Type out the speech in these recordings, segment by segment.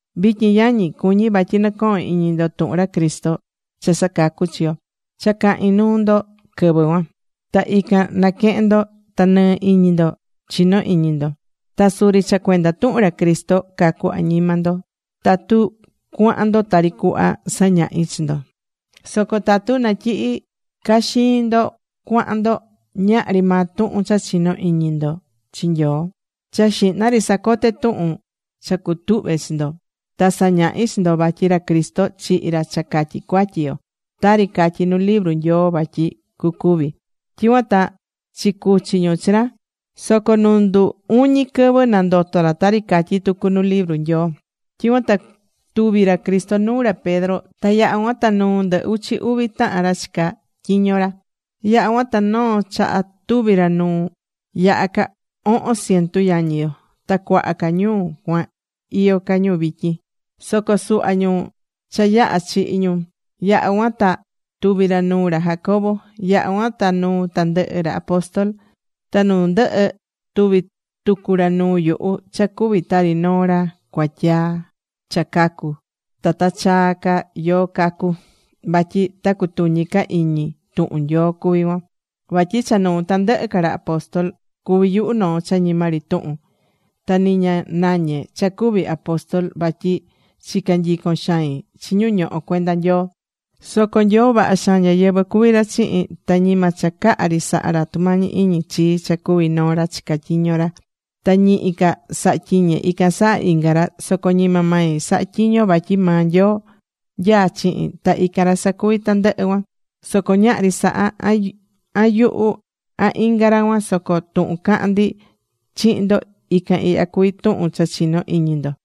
Vityin yañi, cuñí vatyi nɨ̱cohon iñi ndo tuhun ra Cristo, cha sacacú chi yo, cha cahi̱n nuu ndo quɨvɨ cuan. Ta ican naquehe̱n ndo ta nɨɨ iñi ndo chinó iñi ndo. Ta suri cha cuenda tuhun ra Cristo cacú añima ndo tatu cuahán ndo tari cuhva sañahi̱ chi ndo. Soco tatu natyihí caxiin ndo cuahan ndo, ñahri maa tuhun cha chino̱ iñi ndo chi Nyoo. Cha xihna ri sacote̱ tuhun cha cutuhve̱ chi ndo. Ta sañahi̱ chi ndo vatyi ra Cristo chihi̱ ra cha catyi cuatyi yo, tari catyí nu libru Nyoo vatyi cucuvi. Tyicuan ta chicuchi̱ ñu chi ra. Soco nu ndu uñi̱ quɨvɨ nandoto̱ ra tari catyí tucu nu libru Nyoo. Tyicuan ta tuvi̱ ra Cristo nuu ra Pedro ta yaha̱ cuan ta nuu ndɨ uchi uvi tahan ra chicá tyiño ra. Yaha̱ cuan ta noo chaha tuvi̱ ra nuu yaha ca ohon cientu yañi yo. Ta cuaha ca ñu cuan iyó ca ñu vityin. Soco suhva ñu cha yaha̱ chihi̱ ñu. Yaha̱ cuan ta tuvi̱ ra nuu ra Jacobo. Yaha̱ cuan ta nuu tandɨhɨ ra apóstol. Ta nu ndɨhɨ tuvi̱ tucu ra nuu yuhu, cha cuví tari noo ra cuatyaa cha cacu̱ ta ta chaa ca yoo cacu. (Vatyi ta cutuñi ca iñi tuhun Nyoo cuví cuan.) Vatyi cha nuu tandɨhɨ ca ra apóstol cuví yuhu noo cha ñima ri tuhun. Ta ni ña nañé cha cuví apóstol vatyi chica̱ nyicon xain chi ñu ñohó cuenda Nyoo. Soco Nyoo vaha xaan ñáyɨvɨ cuví ra chihin. Ta ñima cha caha ri saha̱ ra tumañi iñi chii cha cuví noo ra chicá tyiño ra. Ta ñihi ca sahá tyiñe ican saha inga ra. Soco ñima mai sahá tyiñe vatyi maa Nyoo nyaá chihin. Ta ican ra sacuví tandɨhɨ cuan. Soco ñahri saha, an yuhu, an inga ra cuan. Soco tuhun cahán ndi chihin ndo, ican ihya cuvi tuhun cha chinó iñi ndo.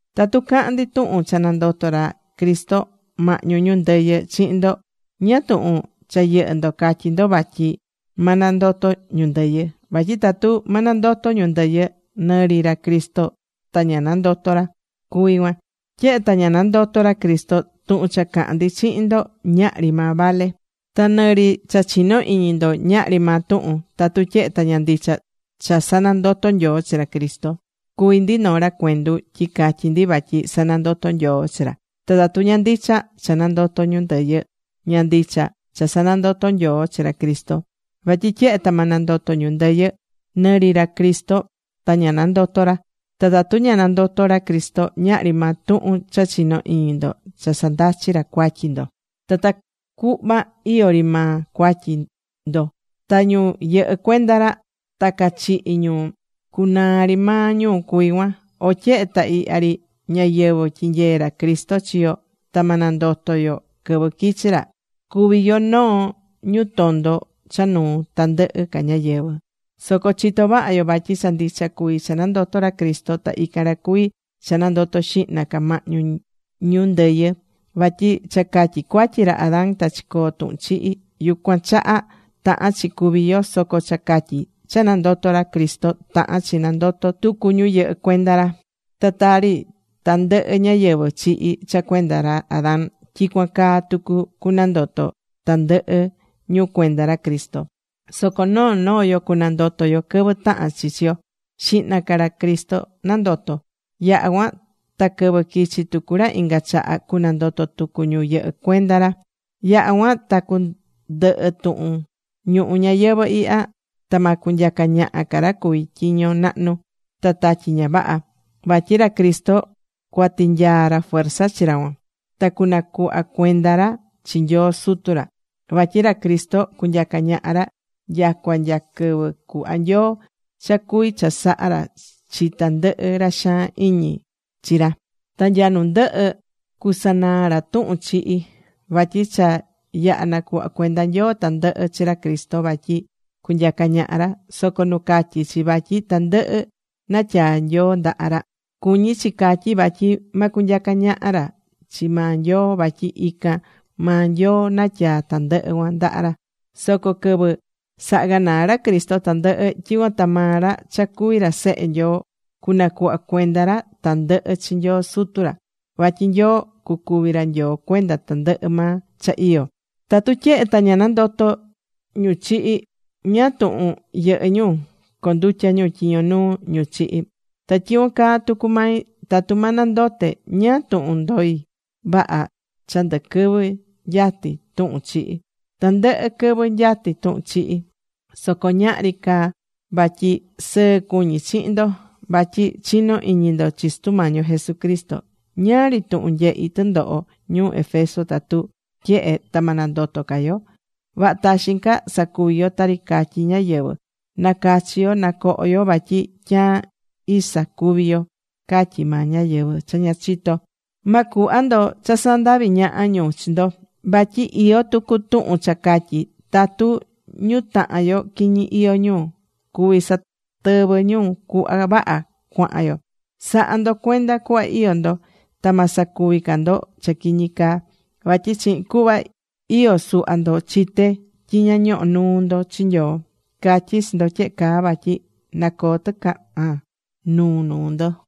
Tatu cahán ndi tuhun cha nandoto̱ ra Cristo mahñu ñu ndɨyɨ chihin ndo, ¿ñáá tuhun cha yɨhɨ́ ndo catyí ndo vatyi ma nandoto ñu ndɨyɨ? Vatyi tatu ma nandoto ñu ndɨyɨ, nɨ ri ra Cristo ta ña nandoto̱ ra cuví cuan. Tyehe ta ña nandoto̱ ra Cristo, tuhun cha cahán ndi chihin ndo ñahri maa vale. Ta nɨ ri cha chinó iñi ndo, ñahri maa tuhun. Tatu tyehe ta ña ndicha cha sanandoto̱ Nyoo chi ra Cristo, cuví ndi noo ra cuendu tyi catyí ndi vatyi sanandoto̱ Nyoo chi ra. Ta tatu ña ndicha cha nandoto ñu ndɨyɨ, ña ndicha cha sanandoto̱ Nyoo chi ra Cristo. Vatyi tyehe ta ma nandoto ñu ndɨyɨ, ni ri ra Cristo ta ña nandoto̱ ra. Ta tatu ña nandoto̱ ra Cristo, ñahri maa tuhun cha chinó iñi ndo cha sandachí ra cuatyi ndo. Ta tacuhva iyó ri maa cuatyi ndo. Ta ñu yɨhɨ́ cuenda ra ta cachihi̱ ñu, cuanaa ri maa ñu cuví cuan. O tyehe ta ihya ri ñayɨvɨ̱ tyinyeé ra Cristo chi yo, ta ma nandoto yo quɨvɨ quichi ra, cuví yo noo ñu tondo cha nuu tandɨhɨ ca ñáyɨvɨ. Soco chitó vaha yo vatyi cha ndicha cuví cha nandoto̱ ra Cristo. Ta ican ra cuví cha nandoto̱ xihna ca mahñu ñu ndɨyɨ. Vatyi cha catyi cuatyi ra Adán ta chicoó tuhun chihi. Yucuan chaha tahán chi cúvi yo. Soco cha catyi cha nandoto̱ ra Cristo tahán chi nandoto tucu ñu yɨhɨ́ cuenda ra. Ta tari tandɨhɨ ñáyɨvɨ chihi̱ cha cuenda ra Adán, tyicuan caa tucu cunandoto tandɨhɨ ñu cuenda ra Cristo. Soco noo noo yo cunandoto yo quɨvɨ tahan chi chi yo. Xihna ca ra Cristo nandoto̱. Yaha cuan ta quɨvɨ quichi tucu ra inga chaha cunandoto tucu ñu yɨhɨ́ cuenda ra. Yaha cuan ta cundɨhɨ tuhun ñuhu ñayɨvɨ̱ ihya ta ma cunyaca ñaha ca ra cuví tyiño nahnu, ta tatyi ña vaha. Vatyi ra Cristo cuatinyaa ra fuerza chi ra cuan. Ta cunacuhva cuenda ra chi Nyoo Sutu ra. Vatyi ra Cristo cunyaca ñaha ra nyacua nya quɨvɨ cuhva Nyoo cha cuvi chasaha ra chi tandɨhɨ ra xaan iñi chi ra. Ta nya nu ndɨhɨ, cusanaa ra tuhun chihi. Vatyi cha yaha̱ nacuhva̱ cuenda Nyoo tandɨhɨ chi ra Cristo vatyi cunyaca ñaha ra. Soco nu catyí chi vatyi tandɨhɨ natyaa Nyoo ndaha ra, cuñí chi catyí vatyi ma cunyaca ñaha ra chi maa Nyoo vatyi ican maa Nyoo natyaa tandɨhɨ cuan ndaha ra. Soco quɨvɨ saha ganaa ra Cristo tandɨhɨ, tyicuan ta maa ra cha cuví ra Sehe Nyoo, cunacuhva cuenda ra tandɨhɨ chi Nyoo Sutu ra. Vatyi Nyoo cucuvi ra Nyoo cuenda tandɨhɨ maa cha iyó. Tatu tyehe ta ña nandotó ñu chihi̱, ¿ñáá tuhun yɨhɨ́ ñu condutyá ñu tyiño nuu ñu chihi̱? Ta tyicuan caa tucu mai, tatu ma nandote, ¿ñáá tuhun ndoí vaha cha ndɨ quɨvɨ nyatí tuhun chihi? Tandɨhɨ quɨvɨ nyatí tuhun chihi. Soco ñahri caa vatyi sɨɨ́ cuñi chihin ndo. Vatyi chinó iñi ndo chi Sutu Mañi yo Jesucristo. Ñáá ri tuhun nyehi̱ tɨndoho ñuu Éfeso tatu tyehe ta ma nandoto ca yo. Vaha taxin ca sacuvi yo tari catyí ñáyɨvɨ: “Na cachi yo, na coho yo vatyi tyaan isa cúvi yo”, catyí maa ñáyɨvɨ cha ña chitó. Ma cuhva ndo cha sandavi ñaha ñu chi ndo. Vatyi iyó tucu tuhun cha catyí: “Tatu ñu tahan yo quiñi iyó ñu, cuví satɨvɨ ñu cuhva vaha cuahan yo.” Sa̱ha ndo cuenda cuhva iyó ndo. Ta ma sacuvi ca ndo cha quiñi caa. Vatyi chihin cuhva iyó suhva ndo chité tyi ña ñohó nuu ndo chi Nyoo. Catyí chi ndo tyehe caa vatyi nacoo tɨcahan nuu nuu ndo.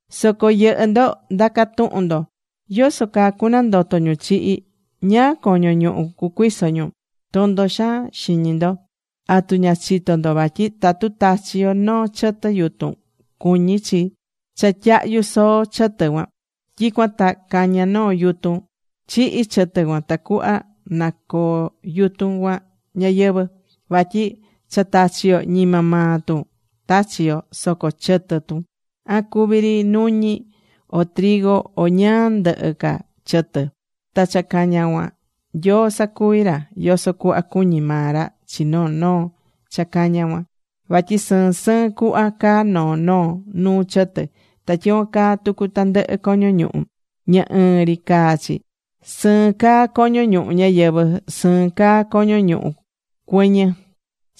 Soco yɨhɨ́ ndo ndacá tuhun ndo: “¿Yoso caa cunandoto ñu chihi? ¿Ñáá coño ñuhu cucuiso ñu?” ¡Tondo xaan xiñi ndo! ¿Atu ña chitó ndo vatyi tatu tachí yo noo chɨtɨ yutun, cuñí chi cha tyahyu soo chɨtɨ cuan? Tyicuan ta cañá noo yutun. (Chihi̱ chɨtɨ cuan tacuhva na coo yutun cuan ñayɨvɨ̱.) Vatyi cha tachí yo ñima maa tun tachí yo. Soco chɨtɨ tun, an cuví ri nuñi, o, o ñáá ndɨhɨ ca chɨtɨ. Ta cha cañá cuan Nyoo sacuví ra yoso cuhva cuñí maa ra chi noo noo cha cañá cuan. Vatyi sɨɨn sɨɨn cuhva caa noo noo nuu chɨtɨ. Ta tyicuan caa tucu tandɨhɨ coño ñuhu, ña ɨɨn ri caá chi. Sɨɨn caa coño ñuhu ñáyɨvɨ. Sɨɨn caa coño ñuhu cuɨñɨ.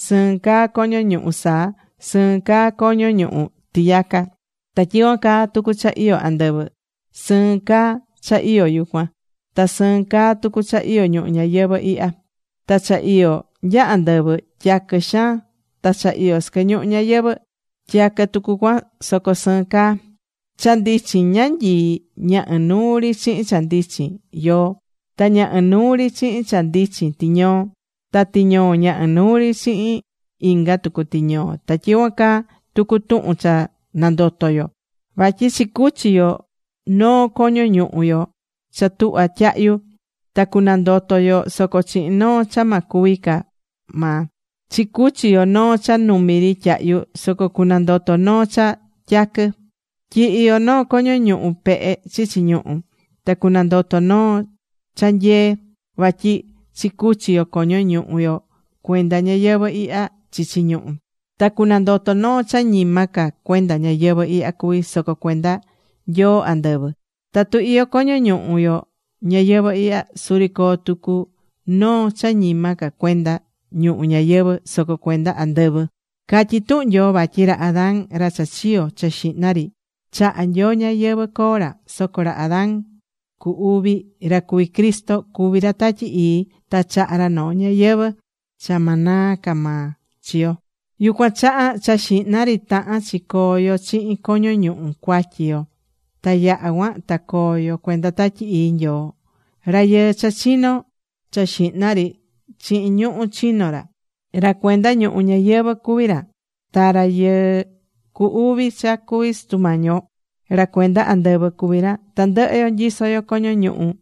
Sɨɨn caa coño ñuhu saa. Sɨɨn caa coño ñuhu tiyaca. Ta tyicuan caa tucu cha iyó andɨvɨ. Sɨɨn caa cha iyó yucuan. Ta sɨɨn caa tucu cha iyó ñuhu ñayɨvɨ̱ ihya. Ta cha iyó nya andɨvɨ tyaquɨ xaan, ta cha iyó sɨquɨ ñuhu ñayɨvɨ̱ tyaquɨ tucu cuan soco sɨɨn caa. Cha ndichin ñanyii, ña inuu ri chihin cha ndichin yoo. Ta ña inuu ri chihin cha ndichin tiñoo. Ta tiñoo ña inuu ri chihin inga tucu tiñoo. Ta tyicuan caa tucu tuhun cha nandoto yo. Vatyi chicuchi yo noo coño ñuhu yo cha tuhva tyahyu. Ta cunandoto yo soco chihin noo cha ma cúvi ca maa. Chicuchi yo noo cha numi ri tyahyu. Soco cunandoto noo cha tyaquɨ. Tyihi yo noo coño ñuhu pehe chichi ñuhú. Ta cunandoto noo cha nyee. Vatyi chicuchí yo coño ñuhu yo cuenda ñayɨvɨ̱ ihya chichi ñuhu. Ta cunandoto noo cha ñima ca cuenda ñayɨvɨ̱ ihya cuví, soco cuenda Nyoo andɨvɨ. Tatu iyó coño ñuhu yo ñayɨvɨ̱ ihya. Suri coo tucu noo cha ñima ca cuenda ñuhu ñayɨvɨ̱, soco cuenda andɨvɨ. Catyí tuhun Nyoo vatyi ra Adán ra cha chiyo̱ cha xihna ri, chaha̱ Nyoo ñayɨvɨ̱ coo ra. Soco ra Adán cu uvi, ra cuví Cristo, cuví ra Tatyi Ii ta chahá ra noo ñayɨvɨ̱ cha ma naa ca maa chi yo. Yucuan chaha, cha xihna ri tahán chi coo yo chihin coño ñuhu cuatyi yo. Ta yaha cuan ta coo yo cuenda Tatyi Ii Nyoo. Rayɨɨ cha chino̱ cha xihna ri, chihin ñuhú chino̱ ra. Ra cuenda ñuhu ñayɨvɨ̱ cuví ra. Ta rayɨɨ cu uvi cha cuví Sutu Mañi yo, ra cuenda andɨvɨ cuví ra. Tandɨhɨ yo nyisó yo coño ñuhu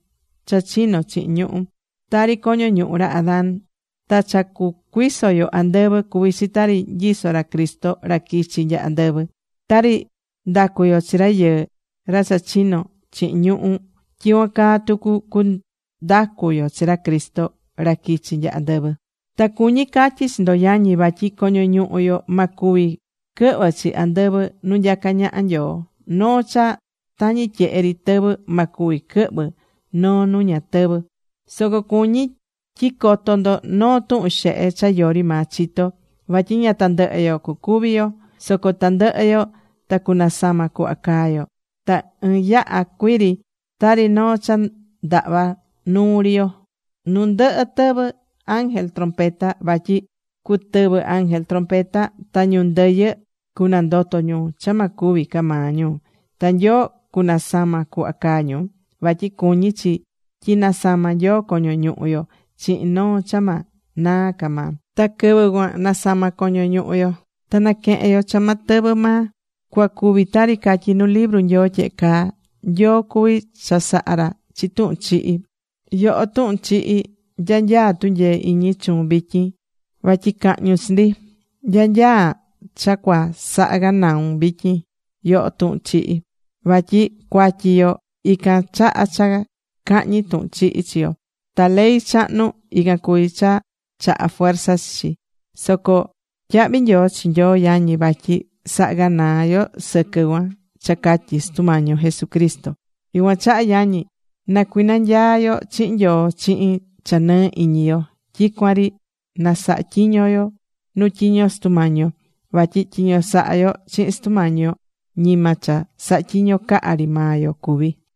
cha chino̱ chihin ñuhú, tari coño ñuhu ra Adán. Ta cha cucuiso yo andɨvɨ cuví chi tari nyisó ra Cristo ra quichi̱ nya andɨvɨ. Tari ndacú yo chi rayɨɨ, ra cha chino̱ chihin ñuhú, tyicuan caa tucu cundacu yo chi ra Cristo ra quichi nya andɨvɨ. Ta cuñí catyi chi ndo yañi, vatyi coño ñuhu yo ma cuvi quɨhvɨ chi andɨvɨ nu nyacá ñaha Nyoo. Noo cha tañi tyehe ri tɨvɨ ma cuvi quɨhvɨ noo nu ña tɨvɨ́. Soco cuñí tyi coto ndo noo tuhun xehe cha yori maa chitó. Vatyi ña tandɨhɨ yo cucúvi yo. Soco tandɨhɨ yo ta cunasama cuhva caa yo. Ta ɨɨn yaha cuii ri, tari noo cha ndahvá nuu ri yo, nu ndɨhɨ tɨvɨ ángel trompeta. Vatyi cutɨvɨ ángel trompeta ta ñu ndɨyɨ cunandoto ñu cha ma cúvi ca maa ñu. Ta Nyoo cunasama cuhva caá ñu. Vatyi cuñí chi tyi nasama Nyoo coño ñuhu yo chihin noo cha ma naa ca maa. Ta quɨvɨ cuan nasama coño ñuhu yo ta quehen yo cha ma tɨvɨ maa. Cua cuvi tari catyí nu libru Nyoo tyehe caa: “Nyoo cuví chasaha ra chi tuhun chihi.” Yoho, Tuhun Chihi, ¿nya nyaa tunyee iñi chuun vityin vatyi cahñun chi ndi? ¿Nya nyaa cha cua saha ganaun vityin, yoho Tuhun Chihi? Vatyi cuatyi yo ican chahá cha cahñi tuhun chihi chi yo. Ta ley chahnu, ican cuví cha chahá fuerza chi chi. Soco tyahví nyoo chi Nyoo, yañi. Vatyi sahá ganaa yo sɨquɨ cuan cha catyi Sutu Mañi yo Jesucristo. Yucuan chaha yañi, na cuinanyaa yo chihin Nyoo chihin cha nɨɨ iñi yo. Tyicuan ri na saha tyiño yo nu tyiño Sutu Mañi yo. Vatyi tyiño sahá yo chihin Sutu Mañi yo, ñima cha sahá tyiño caha ri maa yo cuví.